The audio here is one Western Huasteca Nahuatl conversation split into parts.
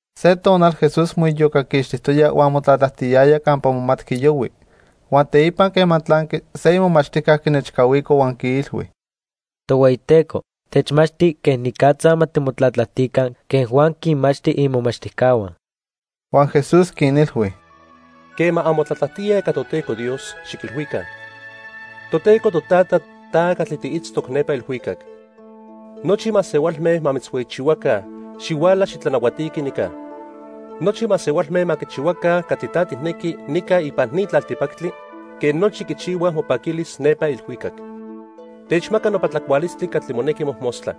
Se tonal Jesús moiyocaquixtijtoya huan motlatlajtiyaya campa momatqui yohui. Huan teipa quema tlanqui, se imomachtijca quinechcahuico huan quiilhui: —Tohueyiteco, techmachti quenicatza ma timotlatlajtica quen Juan quinmachti imomachtijcahua. Huan Jesús quinilhui: —Quema anmotlatlajtíaj ica Toteco Dios, xiquilhuica: Toteco Totata, ta catli tiitztoc nepa ilhuicac. Nochi masehualme ma mitzhueyichihuaca. Xihuala xitlanahuatiqui nica. Nochi masehualme ma quichihuaca catli ta tijnequi nica ipan ni tlaltipactli, quen nochi quichihuaj mopaquilis nepa ilhuicac. Techmaca nopa tlacualistli catli monequi mojmostla.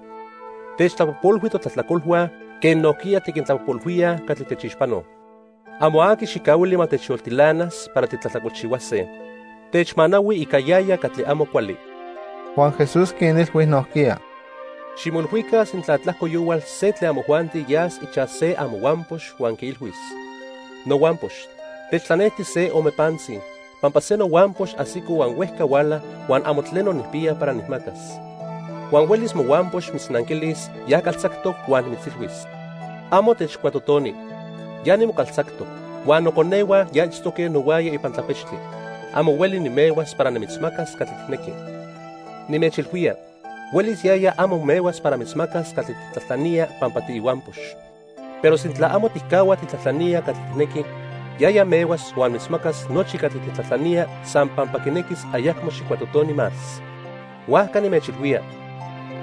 Techtlapojpolhui totlajtlacolhua, quen nojquiya tiquintlapojpolhuíaj catli techixpanoj. Amo aqui xijcahuili ma techyoltilanas para titlajtlacolchihuase. Techmanahui ica yaya catli amo cuali. Huan Jesús quinilhui nojquiya: —Ximoilhuica sintla tlajco yohual se tlen amojuanti yas ichaj se amohuampox huan quiilhuis: 'Nohuampox, techtlanejti se ome pantzi, pampa se nohuampox ajsico huan huejca huala, huan amo tleno nijpiya para nijmacas.' Huan huelis mohuampox mitznanquilis ya caltzactoc huan mitzilhuis: 'Amo techcuatotoni. Ya nimocaltzactoc, huan noconehua ya itztoque nohuaya ipan tlapechtli. Amo hueli nimehuas para nimitzmacas catli tijnequi.' Nimechilhuía, huelis yaya amo mehuas para mitzmacas catli tijtlajtlanía pampa tiihuampox, pero sintla amo tijcahua tijtlajtlanía catli tijnequi, yaya mehuas huan mitzmacas nochi catli tijtlajtlanía san pampa quinequis ayacmo xijcuatotoni más. Huajca nimechilhuía,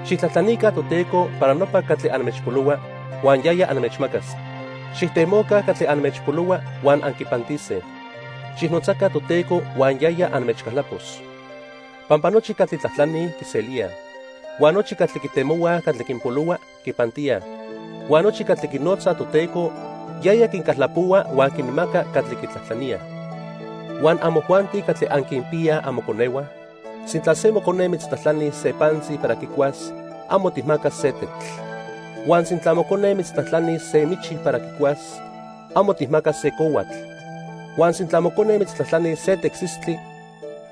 xijtlajtlanica Toteco para nopa catli anmechpolohua, huan yaya anmechmacas. Xijtemoca catli anmechpolohua huan anquipantise. Xijnotzaca Toteco huan yaya anmechcaltlapos. Pampa nochi catli tlajtlanij, quiselíaj. Huan nochi catli quitemohuaj catli quinpolohua, quipantíaj. Huan nochi catli quinotzaj Toteco, yaya quincaltlapohua huan quinmaca catli quitlajtlaníaj. "Huan amojuanti catli anquinpiyaj amoconehua, sintla se mocone mitztlajtlanis se pantzi para quicuas, amo tijmacas se tetl. Huan sintla mocone mitztlajtlanis se michi para quicuas, amo tijmacas se cohuatl. Huan sintla mocone mitztlajtlanis se tecsistli,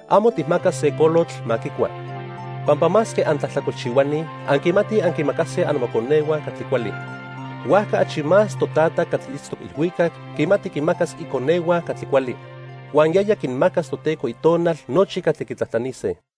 amo tijmacas se colotl ma quicua. Pampa masque antlajtlacolchihuani, anquimatij anquinmacase amoconehua catli cuali. Huajca achi más Totata catli itztoc ilhuicac quimati quinmacas iconehua catli cuali, huan yaya quinmacas Toteco Itonal nochi catli quitlajtlanise."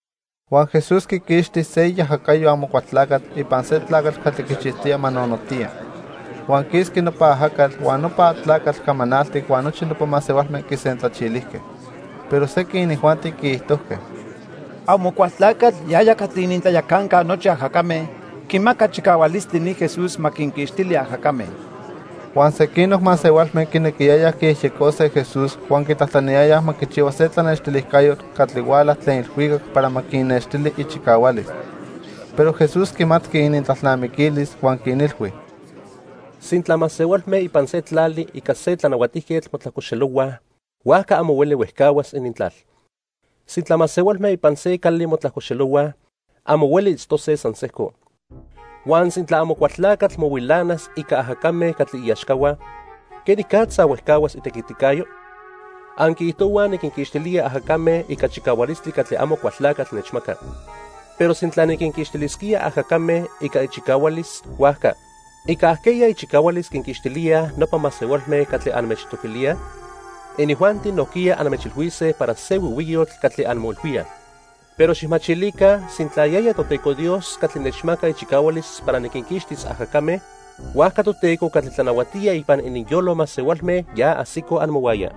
Huan Jesús quiquixti se iajacayo Amocualtlacatl ipan se tlacatl catli quichijtoyaj ma nonotiya. Huan quisqui nopa ajacatl, huan nopa tlacatl camanaltic huan nochi nopa masehualme quisentlachilijque. Pero sequin inijuanti quiijtojque: "Amocualtlacatl yaya catli inintlayacanca nochi ajacame quimaca chicahualistli ni Jesús ma quinquixtili ajacame." Huan sequinoc masehualme quinequiyayaj quiyejyecose Jesús huan quitlajtlaniyayaj ma quichihua se tlanextilijcayotl catli huala tlen ilhuicac para ma quinnextili ichicahualis. Pero Jesús quimatqui inintlalnamiquilis huan quinilhui: "Sintla masehualme ipan se tlali ica se tlanahuatijquetl motlajcoxelohuaj, huajca amo hueli huejcahuas inintlal. Sintla masehualme ipan se cali motlajcoxelohuaj, amo hueli itztose san sejco. Huan sintla Amocualtlacatl mohuilanas ica ajacame catli iaxcahua, ¿quenicatza huejcahuas itequiticayo? Anquiijtohuaj niquinquixtilía ajacame ica chicahualistli catli Amocualtlacatl nechmaca. Pero sintla niquinquixtilisquía ajacame ica ichicahualis, huajca ¿ica ajqueya ichicahualis quinquixtilíaj nopa masehualme catli anmechtoquilíaj? Inijuanti nojquiya anmechilhuise para se huihuiyotl catli anmoilhuíaj. Pero xijmachilica, sintla yaya Toteco Dios catli nechmaca ichicahualis para niquinquixtis ajacame, huajca Toteco catli tlanahuatía ipan ininyolo masehualme ya ajsico amohuaya.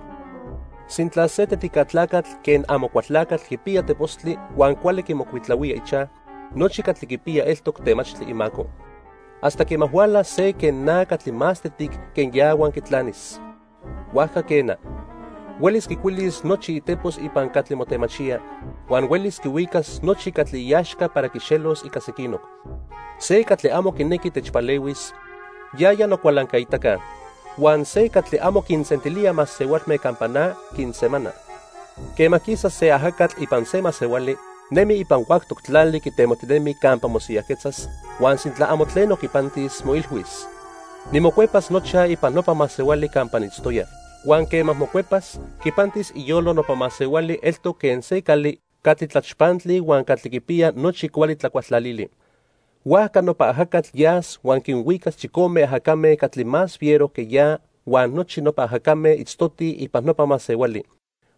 "Sintla se tetica tlacatl quen Amocualtlacatl quipiya tepostli huan cuali quimocuitlahuía ichaj, nochi catli quipiya eltoc temachtli imaco, hasta quema hualas se quen na catli más tetic que ya huan quitlanis. Huajca quena, huelis quicuilis nochi itepos ipan catli motemachía, huan huelis quihuicas nochi catli iaxca para quixelos ica sequinoc. "Se catli amo quinequi techpalehuis, yaya nocualancaitaca. Huan se catli amo quinsentilía masehualme campa na, quinsemana. "Quema quisa se ajacatl ipan se masehuali, nemi ipan huactoc tlali quitemojtinemi campa mosiyajquetzas, huan sintla amo tleno quipantis, moilhuis: 'Nimocuepas nochaj ipan nopa masehuali campa niitztoya.' Huan quema mocuepas, quipantis iyolo nopa masehuali eltoc quen se cali catli tlachpantli huan catli quipiya nochi cuali tlacualtlalili. Huajca nopa ajacatl yas huan quinhuicas chicome ajacame catli más fiero que ya huan nochi nopa ajacame itztotij ipan nopa masehuali.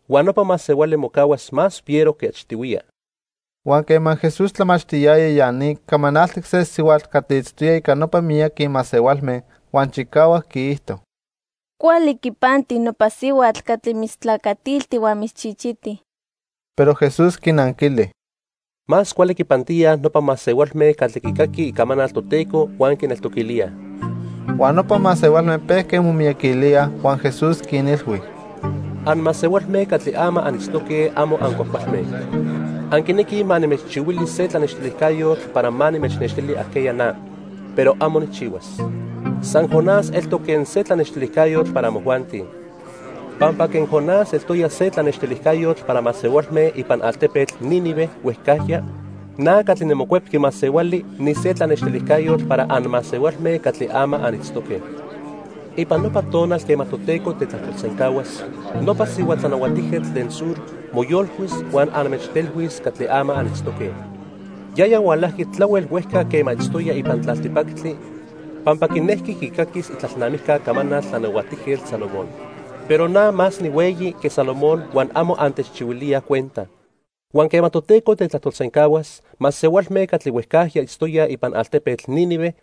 Huan nopa masehuali mocahuas más fiero que achtihuiya." Huan quema Jesús tlamachtiyaya ya ni, camanaltic se sihuatl catli itztoya ica nopa miyaqui masehualme, huan chicahuac quiijto: —Cuali quipanti nopa sihuatl catli mitztlacatilti huan mitzchichiti. Pero Jesús quinanquili: —Más cuali quipantíaj nopa masehualme catli quicaquij icamanal Toteco huan quineltoquilíaj. Huan nopa masehualme pejque momiyaquilíaj huan Jesús quinilhui: —Anmasehualme catli ama anitztoque amo ancuajcualme. Anquinequij ma nimechchihuili se tlanextilijcayotl para ma nimechnextili ajqueya na. Pero amo nijchihuas. San Jonás eltoc quen se tlanextilijcayotl para amojuanti. Pampa quen Jonás eltoya se tlanextilijcayotl para masehualme ipan altepetl Nínive huejcajya, na catli niMocuepqui Masehuali nise tlanextilijcayotl para anmasehualme catli ama anitztoque. Ipan nopa tonal quema Toteco tetlajtolsencahuas, nopa sihua tlanahuatijquetl tlen Sur moyolcuis huan anmechtelhuis catli ama anitztoque. Yaya hualajqui tlahuel huejca quema itztoya ipan tlaltipactli pampa quinejqui quicaquis itlalnamijca camanal Tlanahuatijquetl Salomón. Pero na más nihueyi que Salomón huan amo antechchihuilíaj cuenta. Huan quema Toteco tetlajtolsencahuas, masehualme catli huejcajya itztoyaj ipan altepetl Nínive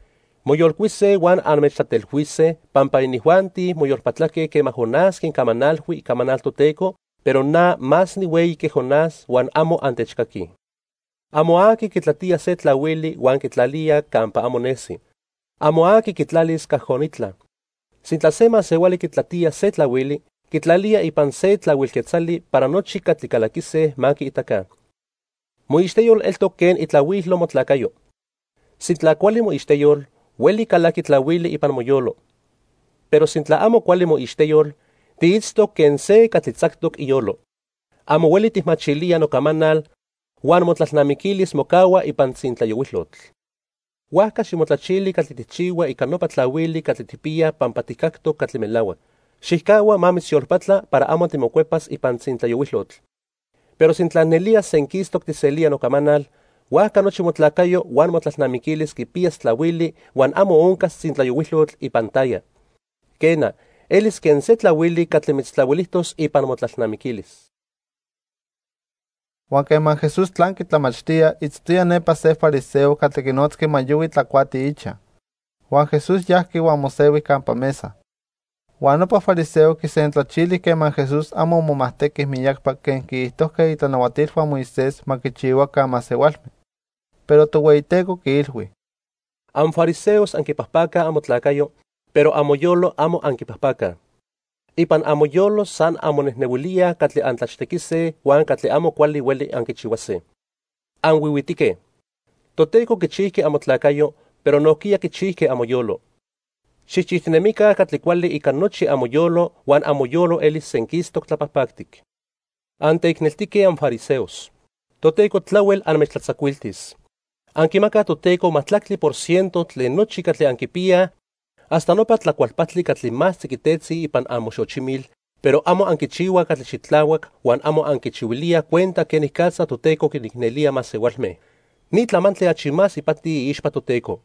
moyolcuise huan anmechtlatelhuise, pampa inijuanti moyolpatlaque quema Jonás quincamanalhui icamanal Toteco, pero na más nihueyi que Jonás huan amo antechcaquij. "Amo aqui quitlatía se tlahuili huan quitlalía campa amo nesi. Amo aqui quitlalis cajonitla. Sintla se masehuali quitlatía se tlahuili, quitlalía ipan se tlahuil quetzali para nochi catli calaquise ma quiitaca. Moixteyol eltoc quen itlahuilo motlacayo. Sintla cuali moixteyol, hueli calaqui tlahuili ipan moyolo. Pero sintla amo cuali moixteyol, tiitztoc quen se catli tzactoc iyolo. Amo hueli tijmachilía nocamanal huan motlalnamiquilis mocahua ipan tzintlayohuilotl. Huajca ximotlachili catli tijchihua ica nopa tlahuili catli tijpiya pampa tijcactoc catli melahuac. Xijcahua ma mitzyolpatla para amo timocuepas ipan tzintlayohuilotl. Pero sintla nelía senquistoc tijselía nocamanal, huajca nochi motlacayo huan motlalnamiquilis quipiyas tlahuili huan amo oncas tzintlayohuilotl ipan taya. Quena, elis quen se tlahuili catli mitztlahuilijtos ipan motlalnamiquilis." Huan quema Jesús tlanqui tlamachtía, itztoya nepa se fariseo catli quinotzqui ma yohui tlacuati ichaj. Huan Jesús yajqui huan mosehui campa mesa. Huan nopa fariseo quisentlachili quema Jesús amo momajtequi miyacpa quen quiijtojque itlanahuatilhua Moisés ma quichihuaca masehualme. Pero Tohueyiteco quiilhui: —Anfariseos anquipajpacaj amotlacayo, pero amoyolo amo anquipajpacaj. Ipan amoyolo san anmonejnehuilíaj catli antlachtequise huan catli amo cuali hueli anquichihuase. ¡Anhuihuitique! Toteco quichijqui amotlacayo, pero nojquiya quichijqui amoyolo. Xijchijtinemica catli cuali ica nochi amoyolo huan amoyolo elis senquistoc tlapajpactic. "¡Anteicneltique anfariseos! Toteco tlahuel anmechtlatzacuiltis. Anquimacaj Toteco majtlactli por ciento tlen nochi catli anquipiyaj hasta nopa tlacualpajtli catli más tziquitetzi ipan amoxochimil, pero amo anquichihuaj catli xitlahuac huan amo anquichihuilíaj cuenta quenicatza Toteco quinicnelía masehualme. Ni tlamantli achi más ipati iixpa Toteco.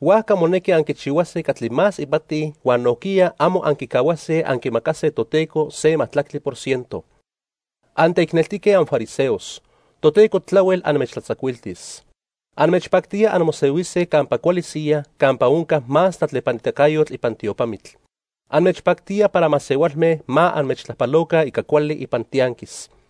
Huajca monequi anquichihuase catli más ipati huan nojquiya amo anquicahuase anquimacase Toteco se majtlactli por ciento. "¡Anteicneltique anfariseos! Toteco tlahuel anmechtlatzacuiltis. Anmechpactía anmosehuise campa cuali siyaj campa onca más tlatlepanitacayotl ipan tiopamitl. Anmechpactía para masehualme ma anmechtlajpaloca ica cuali ipan tianquis.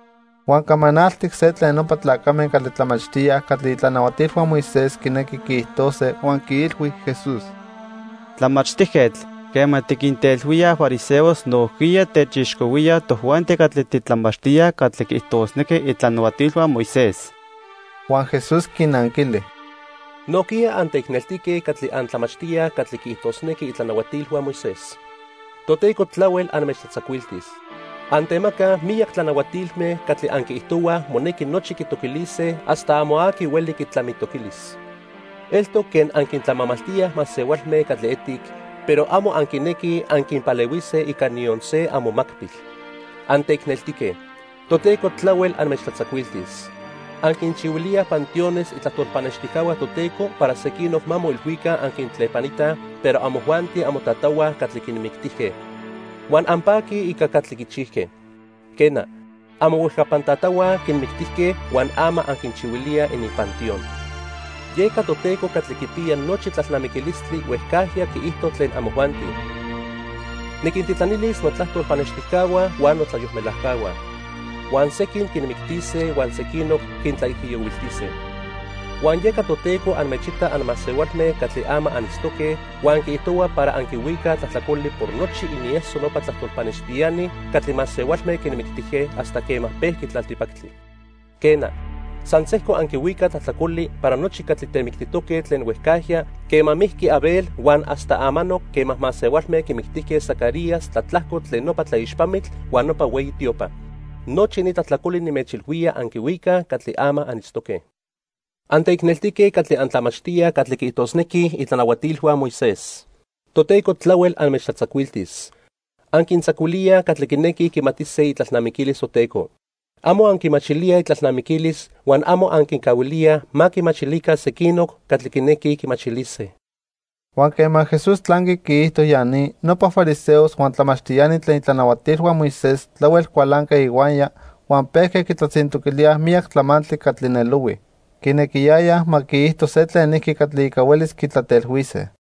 Huan camanaltic se tlen nopa tlacame catli tlamachtíaj catli itlanahuatilhua Moisés quinequij quiijtose huan quiilhui Jesús: —Tlamachtijquetl, quema tiquintelhuía fariseos, nojquiya techixcohuía tojuanti catli titlamachtíaj catli quiijtosnequij itlanahuatilhua Moisés. Huan Jesús quinanquili: —Nojquiya anteicneltique catli antlamachtíaj catli quiijtosnequij itlanahuatilhua Moisés. Toteco tlahuel anmechtlatzacuiltis. Antemacaj miyac tlanahuatilme catli anquiijtohuaj monequi nochi quitoquilise hasta amo aqui hueli quitlamitoquilis. Eltoc quen anquintlamamaltíaj masehualme catli etic, pero amo anquinequij anquinpalehuise ica niyon se amomacpil. "¡Anteicneltique! Toteco tlahuel anmechtlatzacuiltis. Anquinchihuilíaj panteones itlajtol pannextijcahua Toteco para sequinoc ma moilhuica anquintlepanitaj, pero amojuanti amotatahua catli quinmictijque. Huan anpaquij ica catli quichijque. Quena, amohuejcapan tatahua quinmictijque huan ama anquinchihuilíaj ininpanteón. "Yeca Toteco catli quipiya nochi tlalnamiquilistli huejcajya quiijto tlen amojuanti: 'Niquintitlanilis notlajtol pannextijcahua huan notlayolmelajcahua. Huan sequin quinmictise huan sequinoc quintlaijiyohuiltise.' Huan yeca Toteco anmechita anmasehualme catli ama anitztoque huan quiijtohua para anquihuicaj tlajtlacoli por nochi inieso nopa tlajtol pannextiani catli masehualme quinmictijque hasta quema pejqui tlaltipactli. Quena, san sejco anquihuicaj tlajtlacoli para nochi catli temictijtoque tlen huejcajya quema mijqui Abel huan hasta amanoc quema masehualme quimictijque Zacarías tlatlajco tlen nopa tlaixpamitl huan nopa hueyi tiopa. Nochi ni tlajtlacoli nimechilhuía anquihuicaj catli ama anitztoque. "¡Anteicneltique catli antlamachtíaj catli quiijtosnequij itlanahuatilhua Moisés! Toteco tlahuel anmechtlatzacuiltis. Anquintzacuilíaj catli quinequij quimatise itlalnamiquilis Toteco. Amo anquimachilíaj itlalnamiquilis huan amo anquincahuilíaj ma quimachilica sequinoc catli quinequij quimachilise." Huan quema Jesús tlanqui quiijto ya ni, nopa fariseos huan tlamachtiani tlen itlanahuatilhua Moisés tlahuel cualanque ihuaya huan pejque quitlatzintoquilíaj miyac tlamantli catli nelohui. Quinequiyayaj ma quiijto se tlenijqui catli ica huelis quitlatelhuise.